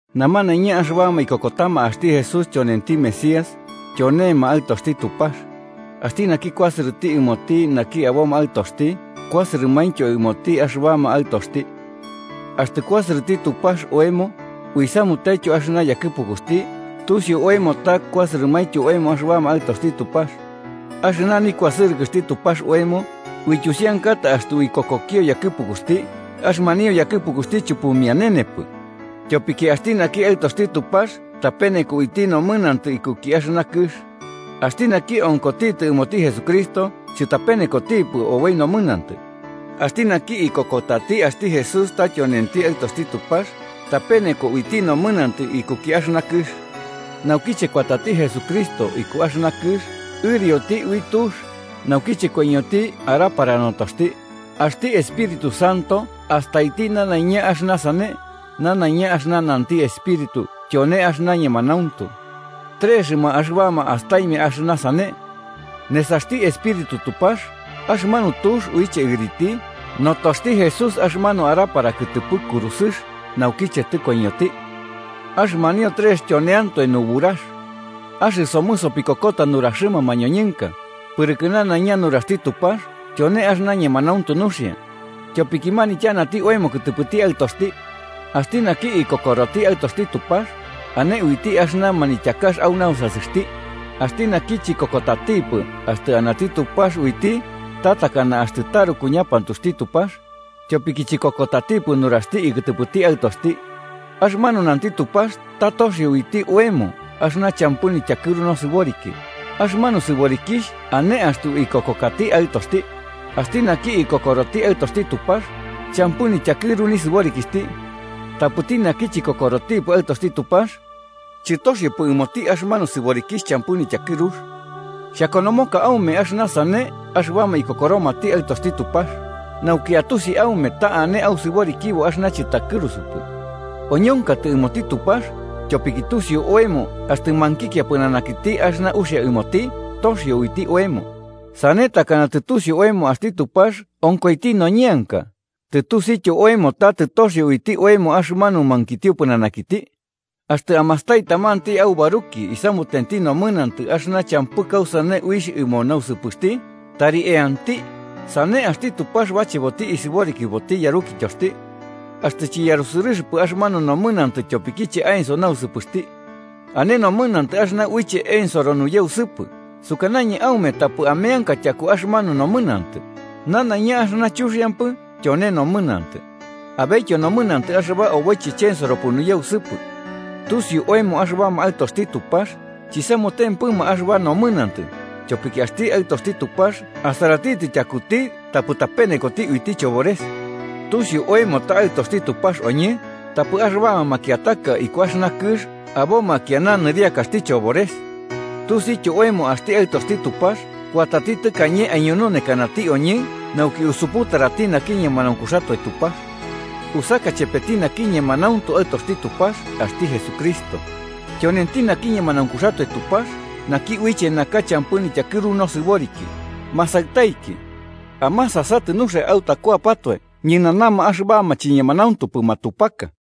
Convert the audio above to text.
Namanaiña axɨbama ikokotama axti Jesús tyonenti Mesías, tyonenti aɨtoxti Tupax. Axti naki kuasɨrɨti ɨmoti naki aboma aɨtoxti, kuasɨrɨmaintyo ɨmoti axɨbama aɨtoxti. Axtɨ kuasɨrɨti Tupax oemo, uisamutentyo axɨna yakɨpukuxti, tusiu oemo ta kuasɨrɨmaintyo oemo axɨbama aɨtoxti Tupax. Axɨna nikuasɨrɨkɨxti Tupax oemo, uityusiankata axtɨ uikokokio yakɨpukuxti, axɨmanio yakɨpukuxti chupumianenepɨ. Tyopiki axti naki aɨtoxti Tupax tapeneko uiti nomɨnantɨ ikuki axɨna kɨx. Axti naki onkotitɨ ɨmoti Jesucristo chɨtapenekotipɨ oboi nomɨnantɨ. Axti naki ikokotati axti Jesús ta tyonenti Aɨtoxti Tupax, tapeneko uiti nomɨnantɨ ikuki axɨna kɨx. Naukiche kuatati Jesucristo iku axɨna kɨx, ɨrioti ui tux, naukiche koiñoti arapara notoxti, axti Espíritu Santo astaiti nanaiña axɨna sane, nanaiña axɨna nanti Epíritu tyone axɨna ñemanauntu. Trexɨma axɨbama astaimia axɨna sane: Nesaxti Espíritu Tupax, axɨmanu tux uiche ɨriti, notoxti Jesús axɨmanu arapara kɨtɨpɨ kurusɨx naukiche tɨkoiñoti. Axɨmanio trex tyoneantoe nuburax. Axɨsomɨ sopikokota nuraxɨma mañoñɨnka, pɨrɨkɨ nanaiña nuraxti Tupax tyone axɨna ñemanauntu nuxia, tyopiki manityanati oemo kɨtɨpɨti Aɨtoxti. Axti naki ikokoroti Aɨtoxti Tupax, ane uiti axɨna manityakax au nausasɨxti. Axti naki chikokotatipɨ axtɨ anati Tupax, uiti ta takana axtɨ taruku ñapantuxti Tupax, tyopiki chikokotatipɨ nuraxti ikɨtɨpɨti Aɨtoxti. Axɨmanu nanti Tupax ta toxio uiti oemo axɨna champɨ nityakɨru nosɨboriki, axɨmanu sɨborikixh ane axtɨ uikokokati Aɨtoxti. Axti naki ikokoroti Aɨtoxti Tupax, champɨ nityakɨru nisɨborikixhti. Tapɨti naki chikokorotipɨ Aɨtoxti Tupax, chɨtoxiopɨ ɨmoti axɨmanu sɨborikixh champɨ nityakɨrux. Xhakonomoka aume axɨna sane axɨbama ikokoromati Aɨtoxti Tupax, nauki atusi aume ta ane ausɨborikibo axɨna chɨtakɨrusupɨ. Oñonkatɨ ɨmoti Tupax, tyopiki tusiu oemo axtɨ mankikia pɨnanakiti axɨna uxia ɨmoti, toxio uiti oemo. Sane takana tɨtusiu oemo axti Tupax onkoiti noñeanka, tɨtusiuityo oemo ta tɨtoxio uiti oemo axɨmanu mankitio pɨnanakiti. Axtɨ amastai tamanti aubaruki isamutenti nomɨnantɨ axɨna champɨ kausane uixh ɨmo nausɨpɨxti, tari eanti, sane axti Tupax bacheboti isɨborikiboti yarukityoxti. Axtɨ chiyarusɨrɨxɨpɨ axɨmanu nomɨnantɨ tyopikiche aenso nausɨpɨxti. Ane nomɨnantɨ axɨna uiche ensoro nuyausɨpɨ, sukanañɨ aume tapɨ ameanka tyaku axɨmanu nomɨnantɨ. Nanaiña axɨna chuxiampɨ tyone nomɨnantɨ. Abetyo nomɨnantɨ axɨba oboiche chensoropɨ nuyausɨpɨ. Tusiu oemo axɨbama aɨtoxti Tupax, chisamutempɨma axɨba nomɨnantɨ, tyopiki axti Aɨtoxti Tupax asaratitɨ tyakuti tapɨ tapenekoti uiti chobores. Tusiu oemo ta aɨtoxti Tupax oñɨ, tapɨ axɨbama makiataka iku axɨna kɨx aboma kiana nɨriakaxti chobores. Tusiuityo oemo axti Aɨtoxti Tupax kuatati tɨkañe aiñununekanati oñɨ nauki usuputarati naki ñemanaunkuxatoe Tupax. Usaka chepeti naki ñemanauntu Aɨtoxti Tupax axti Jesucristo. Tyonenti naki ñemanaunkuxatoe Tupax naki uiche naka champɨ nityakɨru nosɨboriki. Masaɨtaiki, amasasatɨ nuxia autakuapatoe ñɨnanama axɨbama chiñemanauntupɨ matupaka.